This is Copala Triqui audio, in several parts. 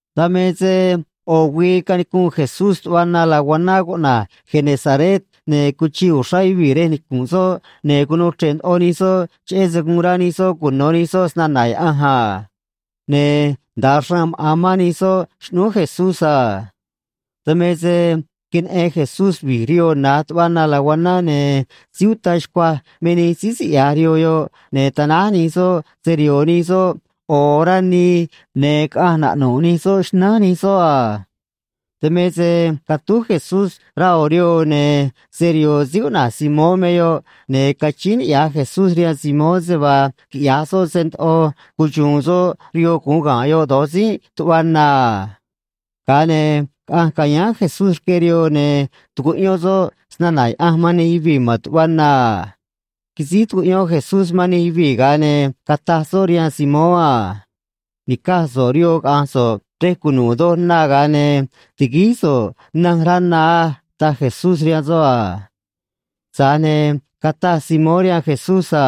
Dan me se ꞌo̱ güii canicunꞌ Jesús tuꞌva na laguaná cuꞌna̱j Genesaret, ne̱ cuchiꞌ uxrá yuvii̱ rej nicu̱nꞌ soꞌ, ne̱ cunuu chre̱ꞌ ndoꞌo nij soꞌ cheꞌé se guun rá nij soꞌ cuno̱ nij soꞌ snana̱ Yaꞌanj a. Ne̱ nda̱a xraan maꞌa̱n mán nij soꞌ xꞌnúú Jesús a. Dan me se queneꞌen Jesús vi̱j rihoo na̱j tuꞌva na laguaná, ne̱ síí uta xcuaj me nij síí siꞌya̱j rihoo yoꞌ, ne̱ tanáj nij soꞌ se‑riho̱o̱ nij soꞌ ꞌo̱ orá nii, ne̱ caꞌanj naꞌnu̱ꞌ nij soꞌ xnánj nij soꞌ a. Dan me se catúj Jesús rá ꞌo̱ rihoo, ne̱ se‑riho̱o̱ síí cuꞌna̱j Simón me yoꞌ, ne̱ cachíín niꞌya̱j Jesús rihaan Simón se vaa quiꞌya̱j soꞌ se ndoꞌo cuxu̱u̱n soꞌ rihoo gu̱un ga̱nꞌ yoꞌ do̱j tzínꞌ tuꞌva na a. Ga̱a ne̱ caꞌanj ca̱yáán Jesús rque rihoo, ne̱ tucuꞌyón soꞌ snana̱ Yaꞌanj man nij yuvii̱ ma̱n tuꞌva na a. Quisíj tucuꞌyón Jesús man nij yuvii̱, ga̱a ne̱ cataj soꞌ rihaan Simón a: ―Ni̱caj so̱ꞌ rihoo caꞌa̱nj so̱ꞌ rej cunu̱u̱ doj na, ga̱a ne̱ ti̱guíj soj nanj rá na á ―taj Jesús rihaan soꞌ a. Tza̱j ne̱ cataj Simón rihaan Jesús a: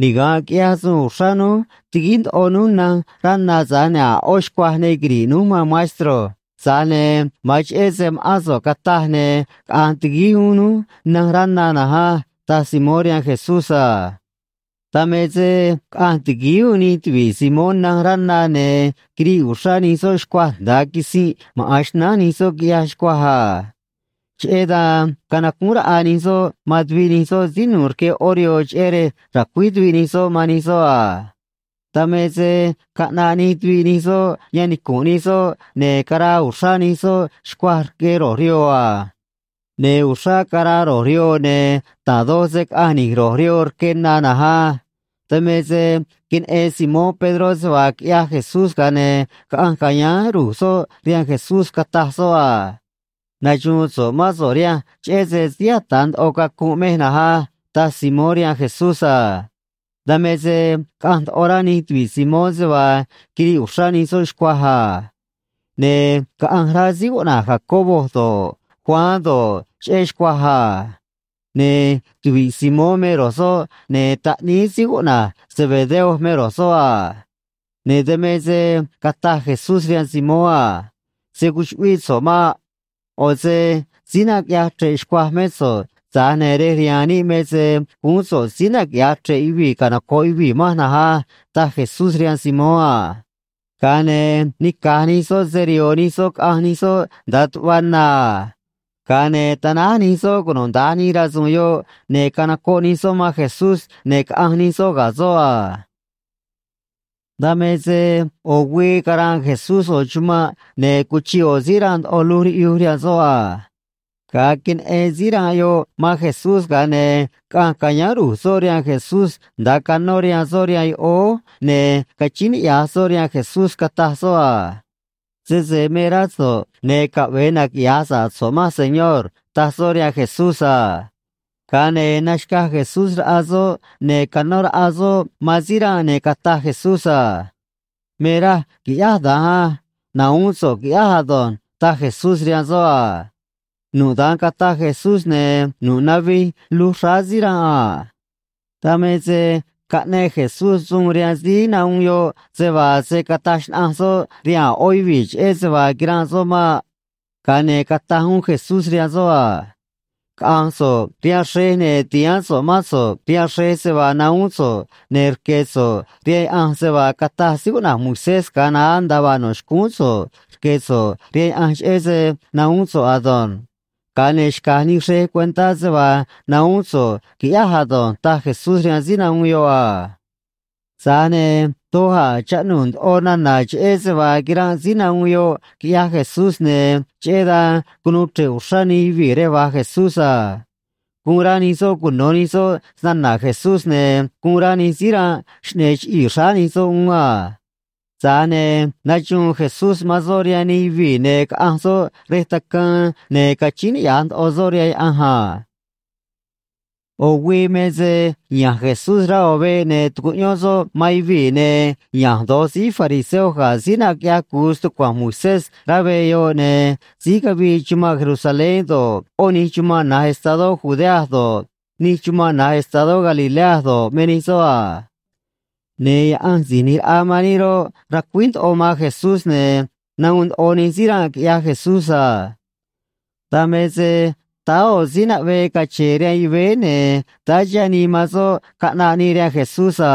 ―Niga̱nꞌ quiꞌyaj suun uxrá núj, tiguíj ndoꞌo núj nanj rá na, tza̱j ne̱ a̱ ꞌó xcuaj ne quiri̱ꞌ núj, maan maestro. Tza̱j ne̱ ma̱an cheꞌé se ma̱ꞌán so̱ꞌ cataj, ne̱ caꞌa̱nj ti̱guíj uún núj nanj rá na na̱nj á ―taj Simón rihaan Jesús a. Dan me se caꞌanj ti̱guíj uún nij tuvi̱ꞌ Simón nanj rá na, ne̱ quiriꞌ uxrá nij soꞌ xcuaj nda̱a quisinꞌ maꞌa̱n xnánj nij soꞌ, quiꞌyaj xcuaj a. Cheꞌé dan canacúún raꞌa nij soꞌ man tuviꞌ nij soꞌ síí nu̱u̱ rque ꞌó rihoo, cheꞌé rej ra̱cuíj tuviꞌ nij soꞌ man nij soꞌ a. Dan me se caꞌnaꞌ nij tuviꞌ nij soꞌ yan nicu̱nꞌ nij soꞌ, ne̱ caraa uxrá nij soꞌ xcuaj rque ro̱j rihoo a. Ne̱ uxrá caraa ro̱j rihoo, ne̱ da̱j doj se caꞌanj ni̱j ro̱j rihoo rque na na̱nj á. Dan me se queneꞌen Simón Pedró se vaa quiꞌyaj Jesús, ga̱a ne̱ caꞌanj ca̱yáán ru̱j soꞌ rihaan Jesús, cataj soꞌ a: ―Naxu̱u̱n so̱ꞌ mán so̱ꞌ rihanj cheꞌé se síí ata̱ ndoꞌo cacunꞌ mej na̱nj á ―taj Simón rihaan Jesús a. Dan me se caꞌanj ndoꞌo rá nij tuvi̱ꞌ Simón se vaa quiriꞌ uxrá nij soꞌ xcuaj a. Ne̱ caꞌanj rá síí cuꞌna̱j Jacobo do̱ꞌ, Juan do̱ꞌ, cheꞌé xcuaj a. Ne̱ tuvi̱ꞌ Simón me ro̱j soꞌ, ne̱ taꞌníí síí cuꞌna̱j Zebedeo me ro̱j soꞌ a. Ne̱ dan me se cataj Jesús rihaan Simón a: ―Se̱ cuchuꞌvíꞌ so̱ꞌ maꞌ. ꞌO̱ se síí naquiꞌyaj chre̱ꞌ xcuaj mé so̱ꞌ, tza̱j ne̱ rej rihaan níꞌ me se guún so̱ꞌ síí naquiꞌya̱j chre̱ꞌ yuvii̱ canoco̱ꞌ yuvii̱ manj na̱nj á ―taj Jesús rihaan Simón a. Ga̱a ne̱ nica̱j nij soꞌ se‑riho̱o̱ nij soꞌ caꞌanj nij soꞌ nda̱a tuꞌva na a. Ga̱a ne̱ tanáj nij soꞌ cunuda̱nj nij rasu̱u̱n yoꞌ, ne̱ canocoꞌ nij soꞌ man Jesús, ne̱ caꞌanj nij soꞌ ga̱ soꞌ a. Dan me se ꞌo̱ güii caranꞌ Jesús ꞌo̱ chumanꞌ, ne̱ cuchiꞌ ꞌo̱ síí ranꞌ ndoꞌo luj riꞌyuj rihaan soꞌ a. Ga̱a queneꞌen síí ranꞌ yoꞌ man Jesús, ga̱a ne̱ caꞌanj ca̱yáán ru̱j soꞌ rihaan Jesús nda̱a canó rihaan soꞌ rihaan yoꞌóó, ne̱ cachíín niꞌya̱j soꞌ rihaan Jesús, cataj soꞌ a: ―Sese me rá so̱ꞌ, ne̱ caꞌve̱e naquiꞌya̱j sa̱ꞌ so̱ꞌ manj, Señor ―taj soꞌ rihaan Jesús a. Ga̱a ne̱ naxca̱j Jesús raꞌa soꞌ ne̱ canó raꞌa soꞌ man síí ranꞌ, ne̱ cataj Jesús a: ―Me raj qui̱ꞌyáj da̱nj á. Na̱huún so̱ꞌ, qui̱ꞌyáj ado̱nj ―taj Jesús rihaan soꞌ a. Nu̱ꞌ da̱nj cataj Jesús, ne̱ nu̱ꞌ navij luj xráá síí ranꞌ a. Dan me se caꞌneꞌ Jesús suun rihaan síí nahuun yoꞌ se vaa se̱ cataj xnaꞌanj soꞌ rihaan a̱ ꞌó yuvii̱ cheꞌé se vaa quiranꞌ soꞌ maꞌ. Ga̱a ne̱ cataj uún Jesús rihaan soꞌ a: ―Caꞌa̱nj so̱ꞌ rihaan xrej, ne̱ ti̱haán so̱ꞌ mán so̱ꞌ rihaan xrej se vaa nahuún so̱ꞌ, ne̱ rque̱ so̱ꞌ rihaan Yaꞌanj se vaa cataj síí cuꞌna̱j Moisés ga̱a naá nda̱a vaa no̱ xcúún so̱ꞌ rque̱ so̱ꞌ rihaan Yaꞌanj cheꞌé se nahuún so̱ꞌ ado̱nj. Ga̱a ne̱ xca̱j nij xrej cuentá se vaa nahuún so̱ꞌ quiꞌyáj ado̱nj ―taj Jesús rihaan síí nahuun yoꞌ a. Tza̱j ne̱ doj a̱ chaꞌnuu̱ ndoꞌo nana̱ cheꞌé se vaa quiranꞌ síí nahuun yoꞌ quiꞌyaj Jesús, ne̱ cheꞌé dan cunuu chre̱ꞌ uxrá nij yuvii̱ rej va̱j Jesús a. Guun rá nij soꞌ cuno̱ nij soꞌ snana̱ Jesús, ne̱ guun rá nij síí ranꞌ xꞌne̱e̱ chiꞌii̱ xráá nij soꞌ uún a. Tza̱j ne̱ naxuun Jesús man soꞌ rihaan nij yuvii̱, ne̱ caꞌanj soꞌ rej tacaan, ne̱ cachíín niꞌya̱j ndoꞌo soꞌ rihaan Yaꞌanj a. ꞌO̱ güii me se ya̱nj Jesús rá ꞌo̱ veꞌ, ne̱ tucuꞌyón soꞌ man yuvii̱, ne̱ ya̱nj do̱j síí fariseo ga̱ síí naquiꞌyaj cu̱u stucua̱nj Moisés rá veꞌ yoꞌ, ne̱ síí cavii chumanꞌ Jerusalén do̱ꞌ, ꞌó nij chumanꞌ na̱j estadó Judea do̱ꞌ, nij chumanꞌ na̱j estadó Galilea do̱ꞌ, me nij soꞌ a. Ne̱ Yaꞌanj Si̱j ꞌNi̱j Raꞌa man níꞌ roꞌ, racuíj ndoꞌo man Jesús, ne̱ nahuun ndoꞌo nij síí ranꞌ, quiꞌyaj Jesús a. Dan me se táá ꞌo̱ síí naꞌvee cache̱e̱ rihaan yuvéé, ne̱ táá chiha̱ nii man soꞌ caꞌnaꞌ nii rihaan Jesús a.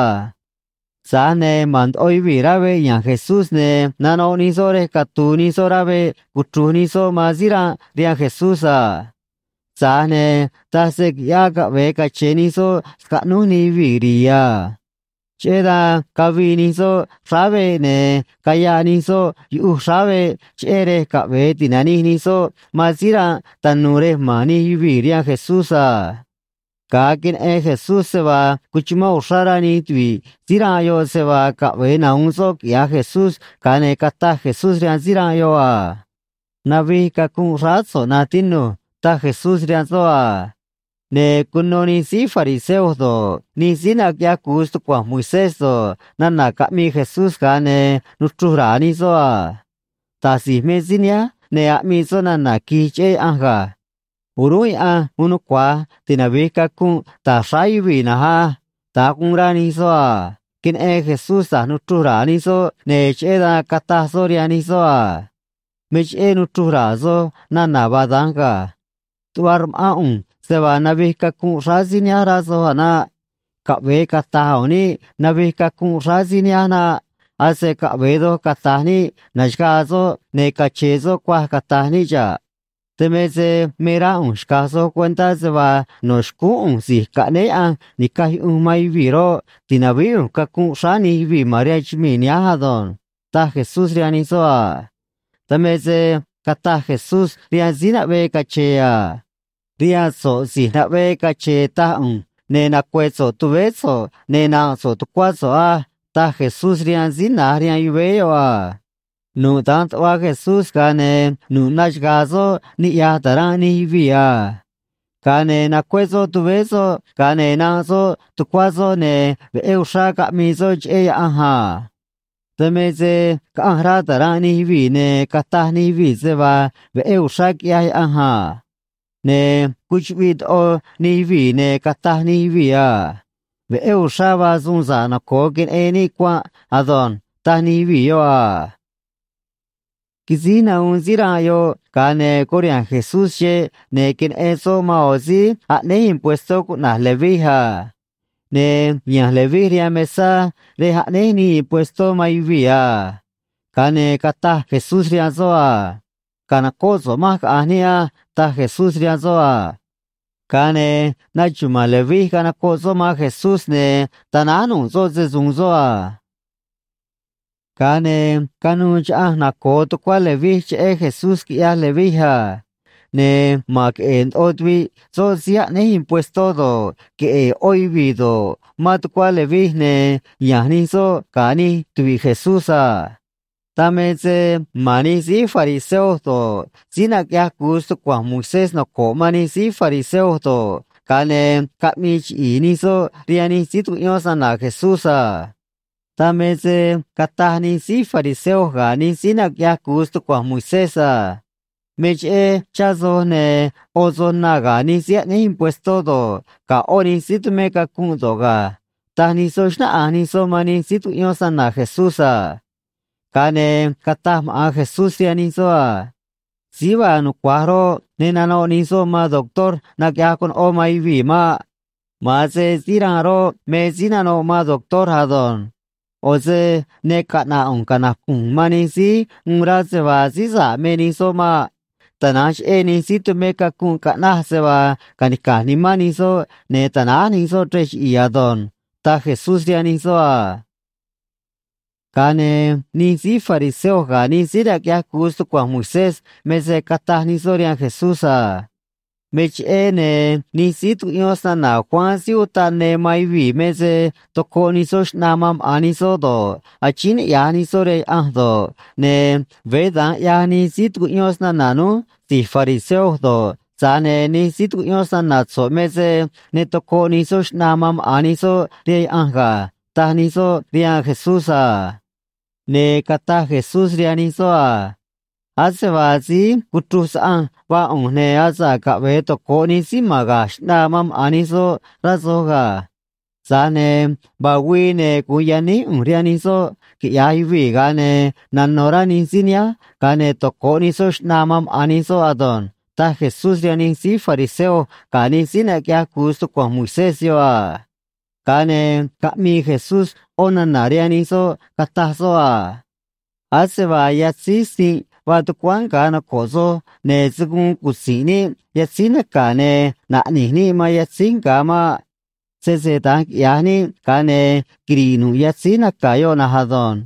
Tza̱j ne̱ ma̱n ndoꞌo yuvii̱ rá veꞌ ya̱nj Jesús, ne̱ nanoꞌ nij soꞌ rej catu̱u̱ nij soꞌ rá veꞌ cuchru̱j nij soꞌ man síí ranꞌ rihaan Jesús a. Tza̱j ne̱ taj se qui̱ꞌyáꞌ caꞌve̱e cache̱n nij soꞌ scaꞌnúj nij yuvii̱ ri̱i̱ a. Cheꞌé dan cavii nij soꞌ xráá veꞌ, ne̱ cayaꞌ nij soꞌ yuꞌuj xráá veꞌ, cheꞌé rej caꞌve̱e ti̱nanij nij soꞌ man síí ranꞌ tanu̱u̱ rej ma̱n nij yuvii̱ rihaan Jesús a. Ga̱a queneꞌen Jesús se vaa cuchumán uxrá rá nij tuvi̱ꞌ síí ranꞌ yoꞌ se vaa caꞌve̱e nahu̱un soꞌ quiꞌya̱j Jesús, ga̱a ne̱ cataj Jesús rihaan síí ranꞌ yoꞌ a: ―Navij cacunꞌ xráá so̱ꞌ, na̱nj tinu̱j ―taj Jesús rihaan soꞌ a. Ne̱ cuno nij síí fariseo do̱ꞌ, nij síí naquiꞌyaj cu̱u stucua̱nj Moisés do̱ꞌ, nana̱ caꞌmii Jesús, ga̱a ne̱ nuchruj ra̱a̱ nij soꞌ a: “Da̱j si̱j me síí nihánj, ne̱ aꞌmii soꞌ nana̱ qui̱j cheꞌé Yaꞌanj ga̱. O̱rúnꞌ Yaꞌanj uun nucua̱j tinavi̱j cacunꞌ ta̱j xráá yuvii̱ na̱nj á.” Da̱nj guun rá nij soꞌ a. Queneꞌen Jesús da̱j nuchruj ra̱a̱ nij soꞌ, ne̱ cheꞌé dan cataj soꞌ rihaan nij soꞌ a: ―Me cheꞌé nuchruj ra̱a̱ soj nana̱ vaa da̱nj ga̱. Tuꞌva rma̱ꞌán ꞌu̱nj se vaa navij cacunꞌ xráá síí nihánj, rá soj a̱ naꞌ. Caꞌve̱e cata̱j u̱u̱n níꞌ navij cacunꞌ xráá síí nihánj naꞌ. Ase caꞌve̱e doj cata̱j níꞌ na̱xagaa soꞌ, ne̱ cache̱e̱ soꞌ cuaj, cata̱j níꞌ xa̱ꞌ. Dan me se me rá ꞌu̱nj xca̱j soj cuentá se vaa no̱ xcúún ꞌu̱nj Si̱j Caꞌnéé Yaꞌanj Ni̱caj Yuꞌunj man Yuvii̱ roꞌ, ti̱navíí ꞌu̱nj cacunꞌ xráá nij yuvii̱ ma̱n rihaan chumii̱ nihánj ado̱nj ―taj Jesús rihaan nij soꞌ a. Dan me se cataj Jesús rihaan síí naꞌvee cache̱e̱ a: ―Rihaan so̱ꞌ si̱j naꞌvee cache̱e̱ taj ꞌu̱nj, ne̱ nacue̱ so̱ꞌ tuvéé so̱ꞌ, ne̱ na̱nꞌ so̱ꞌ tucuá so̱ꞌ á ―taj Jesús rihaan síí na̱j rihaan yuvéé yoꞌ a. Nu̱ꞌ da̱nj tuꞌva Jesús, ga̱a ne̱ nu̱ꞌ naxaga̱a̱ soꞌ niꞌya̱j ta̱ranꞌ nij yuvii̱ a. Ga̱a ne̱ nacué soꞌ tuvéé soꞌ, ga̱a ne̱ nanꞌ soꞌ tucuá soꞌ, ne̱ veꞌé uxrá caꞌmii soꞌ cheꞌé Yaꞌanj a. Dan me se caꞌanj rá ta̱ranꞌ nij yuvii̱, ne̱ cataj nij yuvii̱ se vaa veꞌé uxrá quiꞌyaj Yaꞌanj a. Ne̱ cuchuꞌviꞌ ndoꞌo nij yuvii̱, ne̱ cataj nij yuvii̱ a: ―Veꞌé uxrá vaa suun sa̱ꞌ noco̱o queneꞌen níꞌ cuanꞌ ado̱nj ―taj nij yuvii̱ yoꞌ a. Quisíj nahuun síí ranꞌ yoꞌ, ga̱a ne̱ curiha̱nj Jesús xeꞌ, ne̱ queneꞌen soꞌ man ꞌo̱ síí aꞌnéj impuestó cuꞌna̱j Leví a. Ne̱ ya̱nj Leví rihaan mesá rej aꞌnéj nii impuestó man yuvii̱ a. Ga̱a ne̱ cataj Jesús rihaan soꞌ a: ―Ca̱nocóꞌ so̱ꞌ manj, caꞌa̱nj níꞌ á ―taj Jesús rihaan soꞌ a. Ga̱a ne̱ naxuma̱a̱n Leví, canocoꞌ soꞌ man Jesús, ne̱ tanáj nu̱ꞌ soꞌ se‑su̱u̱n soꞌ a. Ga̱a ne̱ canuû chaꞌanj naco̱o tucuá Leví cheꞌé Jesús, quiꞌyaj Leví a. Ne̱ ma̱n queꞌe̱e̱ ndoꞌo tuviꞌ soꞌ síí aꞌnéj impuestó do̱ꞌ, queꞌe̱e̱ ꞌó yuvii̱ do̱ꞌ, mán tucuá Leví, ne̱ ya̱nj nij soꞌ ga̱ nij tuvi̱ꞌ Jesús a. Dan me se ma̱n nij síí fariseo do̱ꞌ, síí naquiꞌyaj cu̱u stucua̱nj Moisés noco̱ꞌ man nij síí fariseo do̱ꞌ, ga̱a ne̱ caꞌmii chiꞌi̱i̱ nij soꞌ rihaan nij síí tucuꞌyón snana̱ Jesús a. Dan me se cataj nij síí fariseo ga̱ nij síí naquiꞌyaj cu̱u stucua̱nj Moisés a: ―Me cheꞌé chá soj ne̱ ꞌo soj na ga̱ nij síí aꞌnéj impuestó do̱ꞌ, ga̱ ꞌó nij síí tumé cacunꞌ do̱ꞌ ga̱ ―taj nij soꞌ, xnáꞌanj nij soꞌ man nij síí tucuꞌyón snana̱ Jesús a. Ga̱a ne̱ cataj maꞌa̱n Jesús rihaan nij soꞌ a: ―Síí vaa nucua̱j roꞌ, ne nanoꞌ nij soꞌ man doctor naquiꞌyaj conoꞌó man yuvii̱ maꞌ. Ma̱an se síí ranꞌ roꞌ, me síí nanoꞌ man doctor ado̱nj. ꞌO̱ se ne caꞌna̱ꞌ ꞌu̱nj canacu̱nj ꞌu̱nj man nij síí uun rá se vaa síí sa̱ꞌ me nij soꞌ maꞌ. Tana̱nj cheꞌé nij síí tumé cacunꞌ caꞌnaj se vaa ca̱nica̱j nimán nij soꞌ ne̱ ta̱náj nij soꞌ chrej chiꞌi̱i̱ ado̱nj ―taj Jesús rihaan nij soꞌ a. Ga̱a ne̱ nij síí fariseo ga̱ nij síí naquiꞌyaj cu̱u stucua̱nj Moisés me se cataj nij soꞌ rihaan Jesús a: ―Me cheꞌé, ne̱ nij síí tucuꞌyón snana̱ Juan Síí Utaꞌ Ne man yuvii̱ me se tocoꞌ nij soꞌ xꞌnaa man maꞌa̱n nij soꞌ do̱ꞌ, achíín niꞌya̱j nij soꞌ rihaan Yaꞌanj do̱ꞌ, ne̱ veé da̱nj ꞌyaj nij síí tucuꞌyón snana̱ núj si̱j fariseo do̱ꞌ, tza̱j ne̱ nij síí tucuꞌyón snana̱ so̱ꞌ me se ne tocoꞌ nij soꞌ xꞌnaa man maꞌa̱n nij soꞌ rihaan Yaꞌanj ga̱ ―taj nij soꞌ rihaan Jesús a. Ne̱ cataj Jesús rihaan nij soꞌ a: ―Ase vaa síí cuchruj saꞌanj vaa ꞌu̱nj, ne̱ asa̱ꞌ caꞌve̱e toco̱ꞌ nij síí ma̱n ga̱j xꞌnaa man maꞌa̱n nij soꞌ, rá soj ga̱. Tza̱j ne̱ vaa güii, ne̱ gu̱un yaníj ꞌu̱nj rihaan nij soꞌ, quiꞌya̱j yuvii̱, ga̱a ne̱ nano̱ rá nij síí nihánj, ga̱a ne̱ toco̱ꞌ nij soꞌ xꞌnaa man maꞌa̱n nij soꞌ ado̱nj ―taj Jesús rihaan nij síí fariseo ga̱ nij síí naquiꞌyaj cu̱u stucua̱nj Moisés yoꞌ a. Ga̱a ne̱ caꞌmii Jesús ꞌó nana̱ rihaan nij soꞌ, cataj soꞌ a: ―Ase vaa yatzíj sinꞌ vaa tucuáán nga̱ noco̱ꞌ soj, ne̱ se̱ guun cutzi̱nꞌ níꞌ yatzíj naca̱ ne̱ naꞌne̱j níꞌ man yatzíj nga̱ maꞌ. Sese da̱nj quiꞌya̱j níꞌ, ga̱a ne̱ quiri̱ꞌ nu̱ꞌ yatzíj naca̱ yoꞌ na̱nj ado̱nj.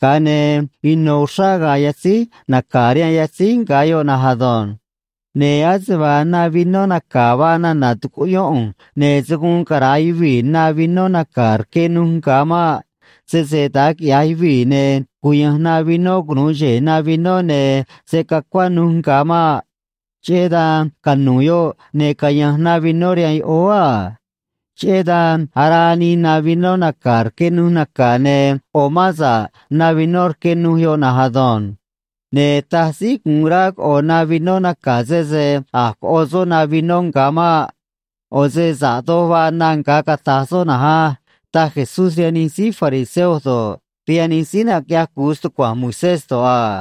Ga̱a ne̱ ino̱ uxrá ga̱a̱ yatzíj naca̱ rihaan yatzíj nga̱ yoꞌ na̱nj ado̱nj. Ne̱ ase vaa na vinó naca̱ vaa nana̱ tucuꞌyón ꞌu̱nj, ne̱ se̱ guun cara̱a yuvii̱ na vinó naca̱ rque nuj nga̱ maꞌ. Sese da̱nj quiꞌya̱j yuvii̱, ne̱ cuya̱nj na vinó cunu̱u xe̱e̱ na vinó, ne̱ se̱ cacuá nuj nga̱ maꞌ. Cheꞌé dan canu̱u̱ yoꞌ, ne̱ caya̱nj na vinó rihaan yoꞌóó a. Cheꞌé dan araa nii na vinó naca̱ rque nuj naca̱, ne̱ ꞌo̱ mán sa̱ꞌ na vinó rque nuj yoꞌ na̱nj ado̱nj. Ne̱ taj síí gu̱un rá coꞌo̱ na vinó naca̱, sese a̱j coꞌo soꞌ na vinó nga̱ maꞌ. ꞌO̱ se sa̱ꞌ doj vaa na nga̱, cata̱j soꞌ na̱nj á ―taj Jesús rihaan nij síí fariseo do̱ꞌ, rihaan nij síí naquiꞌyaj cu̱u stucua̱nj Moisés do̱ꞌ a.